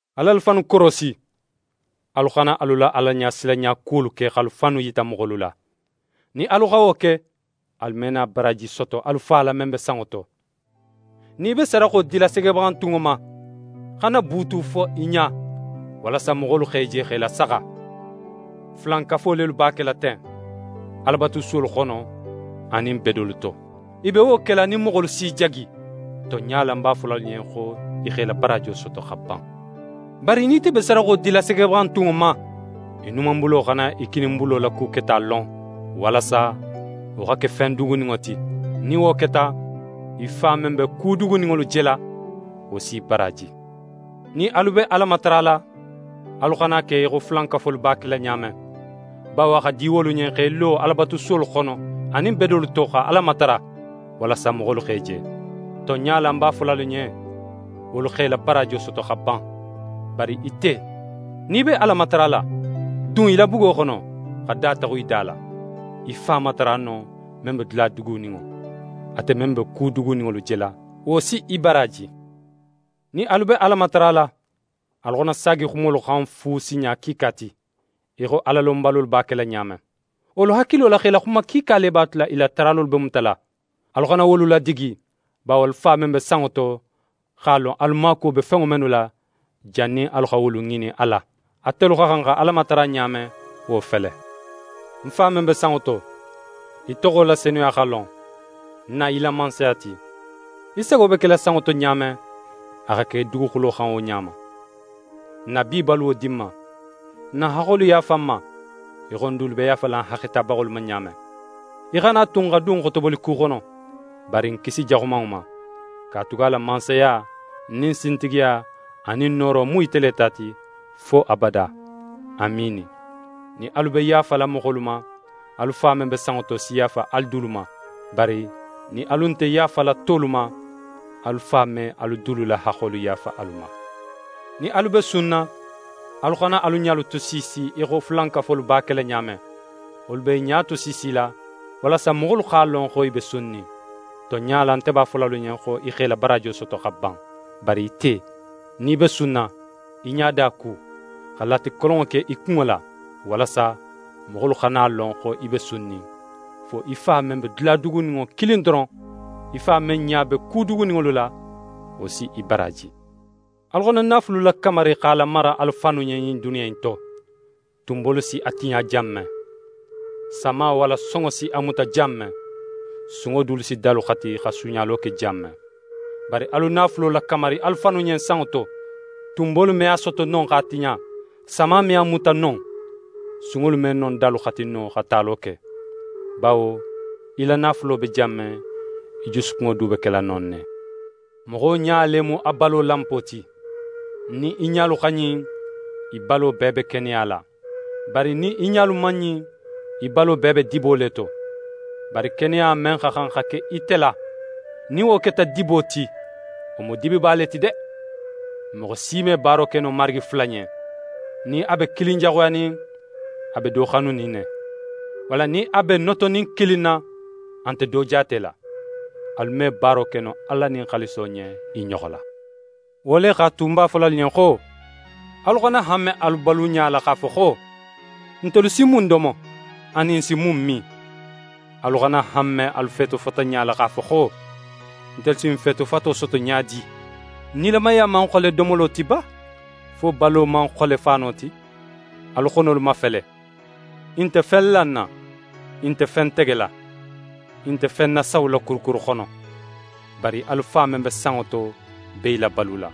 «Al'alu fannu korosi, alu xana alu la Alaɲasilanɲa kuwolu ke x'alu fannu yita moxolu la. Nin alu xa wo ke, alu me na baraaji soto alu Fa la, men be sanŋo to. Nin í be sadaxo dila segebaxantunŋo ma, xana buutu fo í ɲa walasa moxolu x'é je x'é lasaxa. Fulankafo lelu b'a kela ten Alabatusuwolu xono anin bedolu to. I be wo kela nin moxolu s'i jagi. Tonɲa la, ń b'a fola alu ɲen xo i x'e la baraajo soto xa ban. Bari nin ite be sadaxo dila segebaxantunŋo ma, í numanbulo xana í kininbulo la ku keta lon, walasa wo xa ke fen duguninŋo ti. Nin wo keta, í Fa men be ku duguninŋolu jela, wo si í baraaji. «Nin alu be Ala matarala, alu xana a ke í xo fulankafolu b'a kela ɲa men; bawo a xa di wolu ɲen x'e lo Alabatusuwolu xono anin bedolu to xa Ala matara, walasa moxolu x'e je. Tonɲa la, ń b'a fola alu ɲen, wolu x'e la baraajo soto xa ban. Bari ite, nin í be Ala matarala, dun í la bugo xono, xa da taxun í da la. Í Fa matara non, men be dula duguninŋo. Ate men be ku duguninŋolu jela, wo si í baraaji. «Nin alu be Ala matarala, alu xana saagi xumolu xan fu sinɲa kiika ti, í xo Alalonbalolu b'a kela ɲa men. Wolu hakilo la x'e la xuma kiika le b'a tula i la taralolu be mutala. Alu xana wolu ladigi; bawo alu Fa men be sanŋo to x'a lon alu maakuwo be fenŋo mennu la, jannin alu xa wolu ŋinin a la. Atelu xa xan xa Ala matara ɲa men, wo fele: “N Fa men be sanŋo to, í toxo la senuya xa lon, na í la Mansaya ti, í sago be kela sanŋo to ɲa men, a xa ke duguxulo xan wo ɲa ma. N na bi baluwo di n ma, n na haxxolu yaafa n ma, í xo n dulu be yaafala n haxxetabaxolu ma ɲa men. Í xana a tu n xa dun xotoboliku xono, bari n kisi Jaxumanŋo ma. [Katugala mansaya nin sintigiya anin nooro mu ite le ta ti, fo abada. Amiini.]” «Nin alu be yaafala moxolu ma, alu Fa men be sanŋo to si yaafa alu dulu ma; bari nin alu nte yaafala tolu ma, alu Fa me alu dulu la haxxolu yaafa alu ma. «Nin alu be sunna, alu xana alu ɲalu tosiisi í xo fulankafolu b'a kela ɲa men. Wolu b'e ɲa tosiisila, walasa moxolu x'a lon xo i be sunnin. Tonɲa la, nte b'a fola alu ɲen xo i x'e la baraajo soto xa ban. Bari ite, nin í be sunna, í ɲada ku, xa latikolonŋo ke í kunŋo la, walasa moxolu xana a lon xo í be sunnin, fo í Fa men be dula duguninŋo kilin doron. Í Fa men ɲa be ku duguninŋolu la, wo si í baraaji. «Alu xana naafulu lakamari x'a lamara alu fannu ɲen ɲin duniya in to, tunbolu si a tiɲa jan men, sama walla sonŋo si a muta jan men, sunŋo dulu si dalu xati, xa suuɲalo ke jan men. Bari alu naafulo lakamari alu fannu ɲen sanŋo to; tunbolu me a soto non x'a tiɲa, sama me a muta non, sunŋolu me non dalu xati no xa talo ke. Bawo í la naafulo be jan men, í jusukunŋo du be kela non ne. «Moxo ɲa le mu a balo lanpo ti. Nin í ɲalu xa ɲin, í balo bee be keneya la. Bari nin í ɲalu man ɲin, í balo bee be dibo le to. Bari keneya men xa xan xa ke ite la, nin wo keta dibo ti, wo mu dibiba le ti de. «Moxo si me baaro ke no marigi fula ɲen. Nin a be kilin jaxuyanin, a be do xanunin ne. Walla nin a be notonin kilin na, a nte do jaatela. Alu me baaro ke no Ala nin xaaliso ɲen i ɲoxo la. «Wo le x'a tu, ń b'a fola alu ɲen xo: Alu xana hanme alu baluɲa la x'a fo xo: “Ntelu si mun domo, anin n si mun min?” Alu xana hanme alu feetofataɲa la x'a fo xo: “Ntelu si n feetofato soto ɲa di?” Nilamaya man xole domolo ti ba, fo balo man xole faano ti? Alu xonolu mafele, i nte fen lanna, i nte fen tegela, i nte fen nasawula kurukuru xono, bari alu Fa men be sanŋo to be i labalula.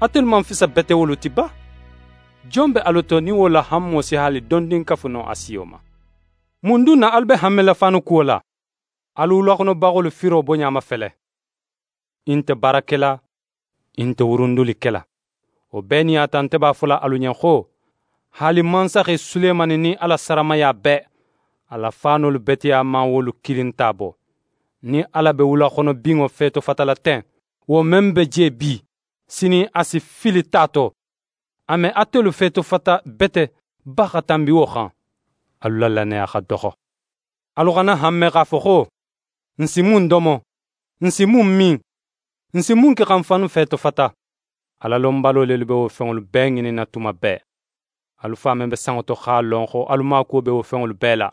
Atelu man fisa bete wolu ti ba? Jon be alu to, nin wo la hanmo si haali dondin kafu no a siyo ma? «Mun dun na alu be hanmela faanu kuwo la? Alu wulaxonobaxolu firo boɲa mafele. I nte baara kela, i nte wurundili kela. Wo bee nin a ta, nte b'a fola alu ɲen xo, haali mansaxe Sulemani nin a la saramaya bee, a la faanolu beteya man wolu kilin ta bo. Nin Ala be wulaxonobinŋo feetofatala ten, wo men be je bi, sinin a si fili ta to, a me atelu feetofata bete ba xa tanbi wo xan? Alu la lannaya xa doxo. Alu xana hanme x'a fo xo: “N si mun domo? N si mun min? N si mun ke xa n fannu feetofata?” Alalonbalo lelu be wo fenŋolu bee ŋininna tuma bee. Alu Fa men be sanŋo to x'a lon xo alu maakuwo be wo fenŋolu bee la.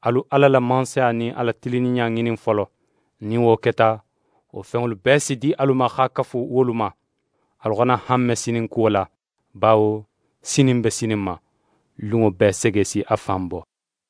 Alu Ala la Mansaya nin a la tilinninɲa ŋinin folo. Nin wo keta, wo fenŋolu bee si di alu ma xa kafu wolu ma. Alu xana hanme sinin kuwo la; bawo sinin be sinin ma. Lunŋo bee sege si a fan bo.